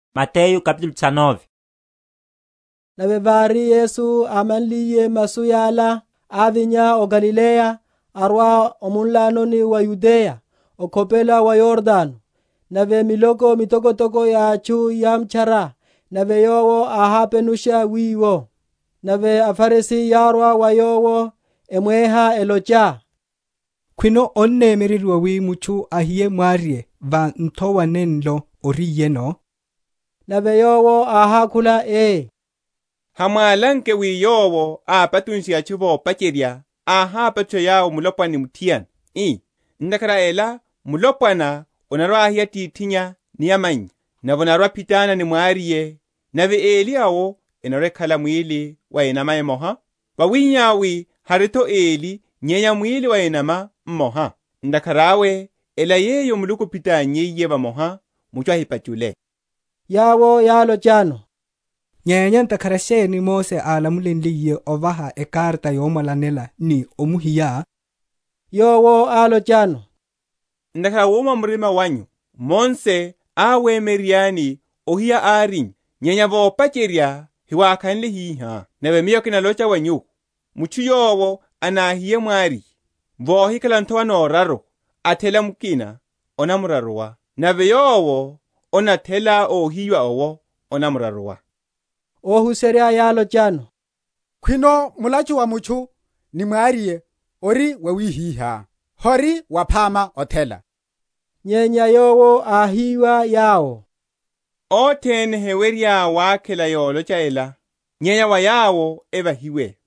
Sa ekarata yomwalanela. Nave vári Yesu ámanliye masu yala, ávinya o Galileya, arwa o munlanoni wa Yudeya, okhopela wa Yordano. Nave miloko mitokotoko ya atchu yámtchara; nave Yowo áhápenusha wiwo. Nave aFarisi yárwa wa Yowo, emweha, elocha, Khwino onnemyereryiwa wi mutchu ahiye mwariye va nthowa nenlo ariyeno? Nave Yowo áhákhula, ii, Hamwálanke wi Yowo ápachunshe atchu vopacherya, áhápachusha yawo mulopwana ni muthiana, ii, Ntakhara a ela mulopwana anarwa ahiya atithinnya ni amannya, nave anarwa‐aphitana ni mwariye, nave eli awo enarwa‐ekhala mwíli wa enama mmoha? wawihihá wi hari’tho eli nyenya mwili wa enama mmoha. Ntakhara awe ela yeyo Muluku áphitannyiye vamoha, mutchu ahipachule. Yawo yálochano, Nyenya ntakhara sheni Mose álamulenliye ovaha ekarata yomwalanela, ni omuhiya? Yowo álochano, Ntakhara a wuma murima wanyu, Mose áwemyereryani ohiya árinyu; nyenya vopacherya hiwákhanle hiha. Nave Miyo kinalocha wa nyuwo, Mutchu yowo anahiye mwariye, vohikhala nthowa na oraruwa, athela mukina, anamraruwa: nave yowo anathela ohiyiwa owo anamraruwa. Óhuserya yálochano, Khwino mulachu wa mutchu ni mwariye ori wawihiha, hori waphama othela. Nyenya Yowo áhiwa yawo, Othene hewerya wakhela yolocha ela, nyenya wa yawo evahiwe.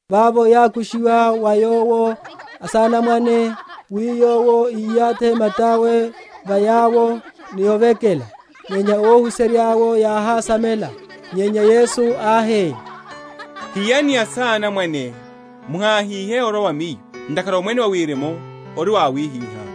Vavo yákushiwa wa Yowo asanamwane, wi Yowo iyathi mata’we va yawo, ni ovekela: nyenya óhuserya’wo yáhásamela. Nyenya Yesu áhi, Hiyani asanamwane, muháhihe orwa wa Miyo: ntakhara Omwene wa Wirimu ori wa awihihá.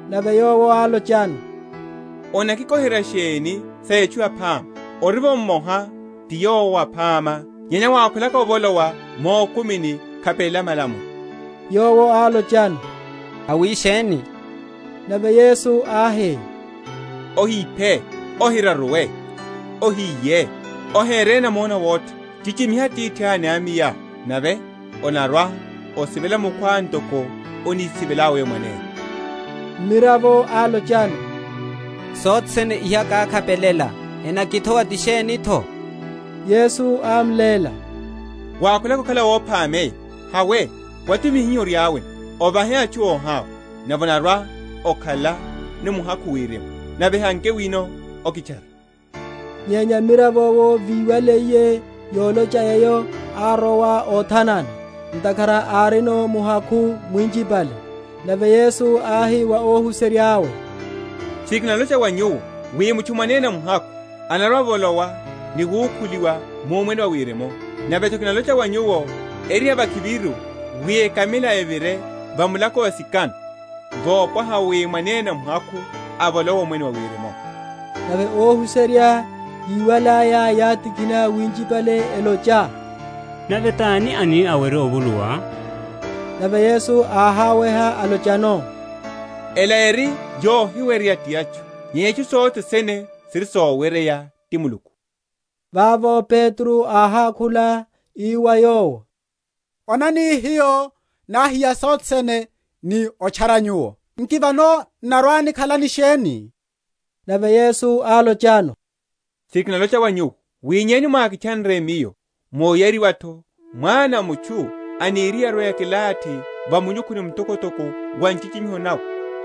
Nave Yowo álochano, Onakikoherya sheni sa etchu yaphama? orivo Mmoha ti Yowo aphama; nyenya wákhwelaka ovolowa mukumini, khapelela malamulo. Yowo álochano, Awisheni? Nave Yesu áhi, Ohiphe, Ohiraruwe, Ohiye, Ohere namona awotha, Chichimiha atithá ni amayá, nave, Onarwa‐osivela mukhwá ntoko onisivelelá weyo mwanene. Mmiravo álochano, Sothene iha kákhapelela, enakithowa ti sheni’tho? Yesu ámléla, Wákhwelaka okhala óphameya, hawe, watumihe hiho oriáno, ovahe atchu óháwa, nave onarwa‐okhala ni muhakhu Wirimu: nave hanke wino, okitchare. Nyenya mmiravo’wo víwaliye yolocha eyo, árowa óthanana: ntakhara árino muhakhu mwinchipale. Nave Yesu áhi wa ohuserya’we, Tchiri kinalocha wa nyuwo, wi mutchu mwanene muhakhu anarwa‐avolowa ni wukhuliwa mu Omwene wa Wirimu. Nave’tho kinalocha wa nyuwo, eri yavakhiviru wi ekamila evire va mulako wa sikano, wopwaha wi mwanene muhakhu avolowe Omwene wa Wirimu. Nave óhuserya, yíwalaya, yátikhina winchipale, elocha, Nave tani anáwerye ovuluwa? Nave Yesu áháweha, álochano, Ela eri yohiweryeya ti atchu, nyenya itchu sothe sene siri soweryeya ti Muluku. Vavo Petro áhákhula, ii wa Yowo, Onani, hiyo náhiya sothene ni otchara Nyuwo; nki vano n’narwa‐nikhala ni sheni? Nave Yesu álochano, Tchiri kinalocha wa nyuwo, wi yenyu mwákitchanre Miyo, mu oyariwa’tho, Mwana a mutchu aniriye arwe‐akilathi va munyukhuni mtokotoko wa nchichimiho nawe,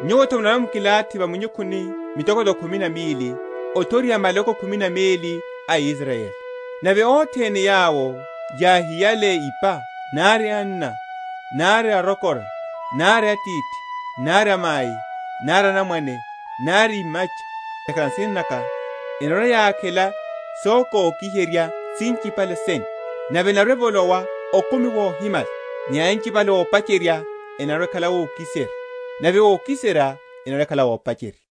nyuwo’tho munarwa‐mukilathi va minyukhuni mitokotoko khumi na mili, othoriha maloko khumi na meli a Israyeli. Nave othene yawo yáhiyale ipa, nari anna, nari arokora, nari atithi, nari amai, nari anamwane, nari imacha, ntakhara a nsina naka, enarwa‐yakhela sokoki?-?heryiwa sinchipale sene, nave enarwa‐evolowa okumi wohimala. Nyenya anchipale ópacherya enarwa‐ekhala ókiserya, nave ókiserya enarwa‐ekhala ópacherya.